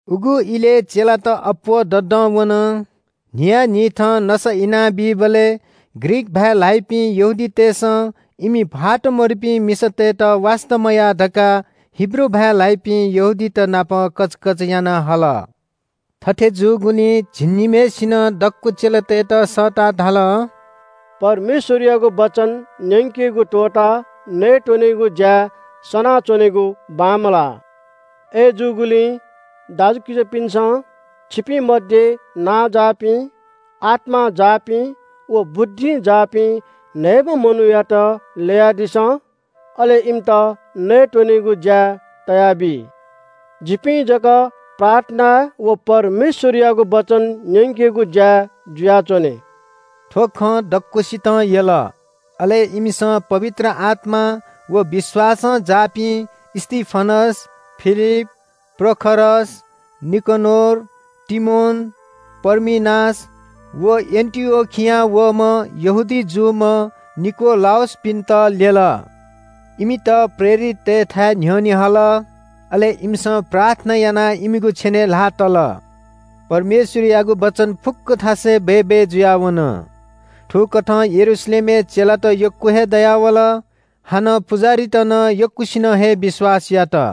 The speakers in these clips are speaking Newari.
उगु इलय् चेलात अप्‍वः ददं वन। न्‍हियान्‍हिथं नसा इनाबीबलय् ग्रीक भाय् ल्‍हाइपिं यहूदीतय्‌सं इमि भाःत मदुपिं मिसातय्‌त वास्‍ता मयाः धकाः हिब्रू भाय् ल्‍हाइपिं यहूदीत नाप कचकच याना हल। थथे जूगुलिं झिंनिम्‍हय्‌सिनं दक्‍व चेलातय्‌त सःताः धाल – “परमेश्‍वरयागु वचन न्‍यंकेगु त्‍वःताः नयेत्‍वनेगु ज्‍याय् सनाच्‍वनेगु बांमलाः। अय्‌जूगुलिं दाजुकिजापिन्‍सं, छिपिं मध्‍ये नांजाःपिं, आत्‍मां जाःपिं व बुद्धिं जाःपिं न्‍हय्‌म्‍ह मनूयात ल्‍ययादिसँ। अले इमित नयेत्‍वनेगु ज्‍याय् तयाबी। जिपिं जक प्रार्थनाय् व परमेश्‍वरयागु वचन न्‍यंकेगु ज्‍याय् जुयाच्‍वने।” थ्‍व खँ दक्‍वसितं यल। अले इमिसं पवित्र आत्‍मां व विश्‍वासं जाःपिं स्‍तिफनस, फिलिप, प्रखरस, निकनोर, तीमोन, पर्मिनास व एन्‍टिओखियां वःम्‍ह यहूदी जूम्‍ह निकोलाउसपिन्‍त ल्‍यल। इमित प्रेरिततय्‌थाय् न्‍ह्यःने हल। अले इमिसं प्रार्थना यानाः इमिगु छेनय् ल्‍हाः तल। परमेश्‍वरयागु वचन फुक्‍क थासय् बय्‌बय् जुयाः वन। थुकथं यरूशलेमय् चेलात यक्‍व हे दयावल। हानं पुजाहारीत नं यक्‍वसिनं हे विश्‍वास यात।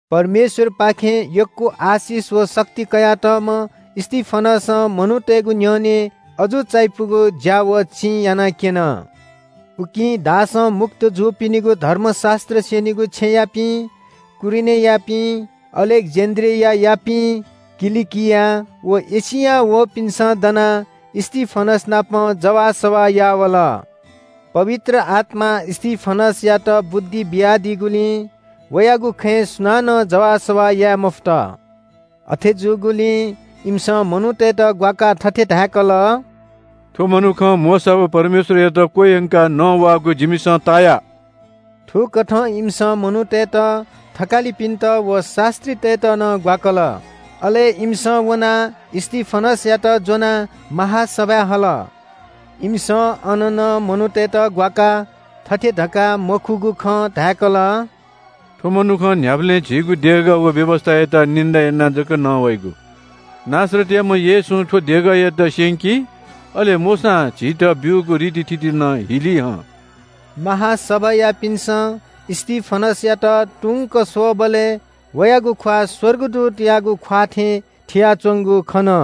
परमेश्‍वरपाखें यक्‍व आशिष व शक्ति कयातःम्‍ह स्‍तिफनसं मनूतय्‌गु न्‍ह्यःने अजू चायापुगु ज्‍या व चिं यानाक्‍यन। उकिं दासं मुक्त जूपिनिगु धर्मशास्‍त्र स्‍यनीगु छेँयापिं, कुरेनीयापिं, अलेक्‍जेन्‍ड्रियायापिं, किलिकिया व एशियां वःपिन्‍सं दनाः स्‍तिफनस नाप जवाःसवाः याः वल। पवित्र आत्‍मां स्‍तिफनसयात बुद्धि बियादीगुलिं वयागु खँय् सुनानं जवाःसवाः याये मफुत। अथे जूगुलिं इमिसं मनूतय्‌त ग्‍वाकाः थथे धाय्‌कल – “थ्‍व मनुखं मोशा व परमेश्‍वरयात क्‍वह्यंकाः नवाःगु जिमिसं ताया।” थुकथं इमिसं मनूतय्‌त, थकालिपिन्‍त व शास्‍त्रीतय्‌त नं ग्‍वाकल। अले इमिसं वनाः स्‍तिफनसयात ज्‍वनाः महासभाय् हल। इमिसं अन नं मनूतय्‌त ग्‍वाकाः थथे धकाः मखुगु खँ धाय्‌कल – “थ्‍व मनुखं न्‍ह्याबलें झीगु देगः व व्‍यवस्‍थायात निन्‍दा यानाः जक नवाइगु। नासरतयाम्‍ह येशूं थ्‍व देगःयात स्‍यंकी, अले मोशां झीत ब्‍यूगु रितिथिति नं हिली हं।” महासभायापिन्‍सं स्‍तिफनसयात तुंक स्‍वःबलय् वयागु ख्‍वाः स्‍वर्गदूतयागु ख्‍वाः थें थियाच्‍वंगु खन।